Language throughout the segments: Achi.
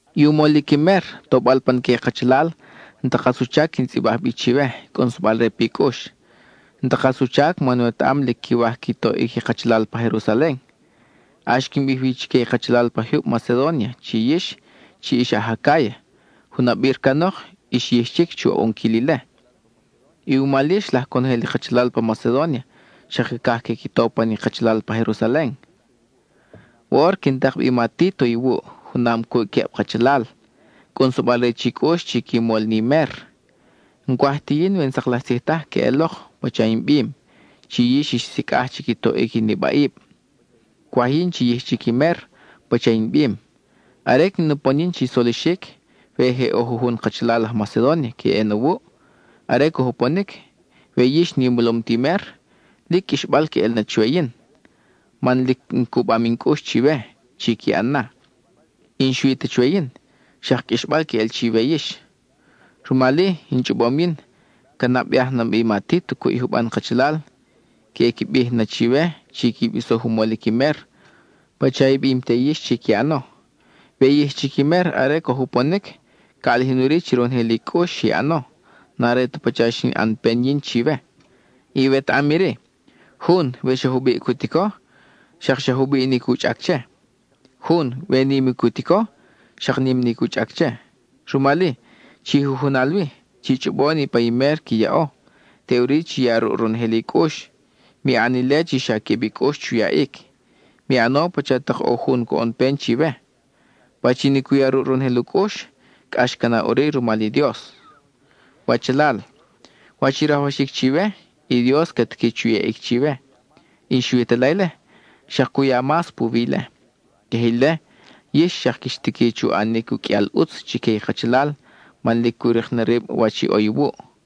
I u molic i mer, tobal pan que i kachalal, n-ta kas u chac quin tzʼibaj bi chiwe, cʼunsabal-re pi cʼux. N-ta kas u chac man wetaʼam lic quiwaj qui toʼic i kachalal pa Jerusalen. ʼAx quin bij wi chique i kachalal pa jyub Macedónia chi yix, chi ix aj Acáya, junabir canok ix yij chic chu ʼonquil ile. Iwumal yix, laj conojel i kachalal pa Macedónia xak cacaj que qui to pan i kachalal pa Jerusalen. Woʼor quin tak bi ma Títo iwuʼ, junam cuʼ i queb kachalal, cʼunsabal-re chi cʼux chi qui mol ni mer. N-cwaj ti yin we n-sak laj tzij taj queʼelok pacha in bim, chi yix ix sicʼaj chi qui toʼic i nibaʼib; cwaj yin chi yij chic i mer pacha in bim. Are quin upon yin chi solixic, we je ʼo jujun kachalal aj Macedónia que ʼe na wuʼ, are coj uponic, we yix ni molom ti mer, lic qʼuixbal queʼel na chwe yin, man lic in cubam in cʼux chiwe chi qui ʼan na. Y n-xui ta chwe yin, xak qʼuixbal queʼel chiwe yix. Rumal-i, in chʼobom yin, ca nabeaj bi ma Títo cuʼ i juban kachalal, que qui bij na chiwe chi qui bisoj u molic i mer, pacha i bim te yix chi qui ʼano. We yij chic i mer are coj uponic, ca ʼalijin ʼuri chi ronojel i cʼux xi ʼano, n-are ta pacha xin ʼan pen yin chiwe. Iwetaʼam iri: jun, we xa jubiʼ cu tico, xak xa jubiʼ ni cu chʼac che. Jun, we nim i cu tico, xak nim ni cu chʼac che. Rumal-i, chi jujunal wi, chi chʼobo niʼpa i mer qui yaʼo; teʼuri chi ya ruʼ ronojel i cʼux; mi ʼan ile chi xa queb i cʼux chu yaʼic; mi ʼano pacha tak ʼo jun coʼon pen chiwe. Pachin i cu ya ruʼ ronojel u cʼux, cʼax ca naʼ ʼuri rumal i Dios. Wachalal, wach i rajwaxic chiwe, i Dios ca tiqui chu yaʼic chiwe, y n-xui ta la ile, xak cu ya mas puwi ile. Queje ile, yix xak quix tiqui chu ʼanic u qʼuial ʼutz chique i kachalal, man lic cu rik na rib wach i ʼo iwuʼ.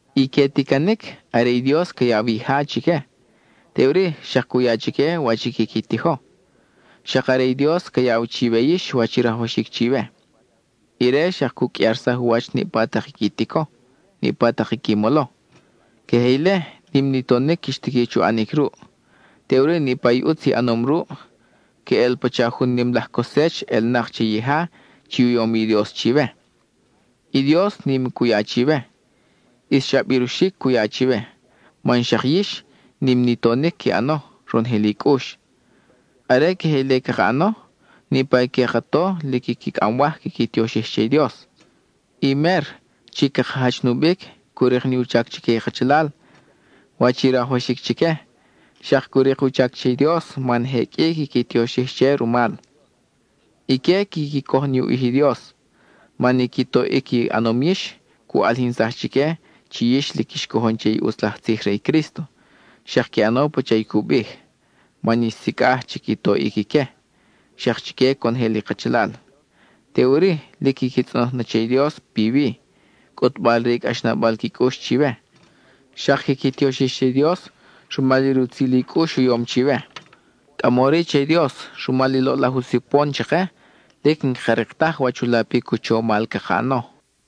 I que ticanic, are i Dios ca yaw i ija chique, teʼuri, xak cu ya chique wach i quiqui tijo. Xak are i Dios ca yaw chiwe yix wach i rajwaxic chiwe; ire xak cu qʼuiarsaj u wach niʼpa tak i qui tico, niʼpa tak i qui molo. (Queje ile, nim ni tonic quix tiqui chu ʼanic ruʼ, teʼuri niʼpa i ʼutz i ʼanom ruʼ, queʼel pacha jun nim laj cosech elnak che i ija chi u yom i Dios chiwe.) I Dios, nim cu ya chiwe; ʼis xa biruxic cu ya chiwe, man xak yix, nim ni tonic qui ʼano, ronojel i cʼux. Are queje ile caka ʼano, niʼpa i que ka to lic quiqui cʼamwaj quiqui tioxij che i Dios. I mer, chi caka jach nubic, cu rik ni u chac chique i kachalal, wach i rajwaxic chique, xak cu rik u chac che i Dios man je qʼui quiqui tioxij che rumal. Ique quiqui coj ni u ʼij i Dios, man i qui toʼic i ʼanom yix, cu ʼalijinsaj chique chi yix lic quix cojon che i ʼutz laj tzij re i Crísto, xak qui ʼano pacha i cu bij, man ix sicʼaj chi qui toʼic ique, xak chique conojel i kachalal. Teʼuri, lic quiqui tzʼonoj na che i Dios piwi, cutbal re i cʼaxnabal qui cʼux chiwe, xak quiqui tioxij che i Dios rumal i rutzil i cʼux u yom chiwe. Cʼamori che i Dios rumal i loʼlaj u sipon chake; lic n-caka rik taj wach u lapic u chomal caka ʼano.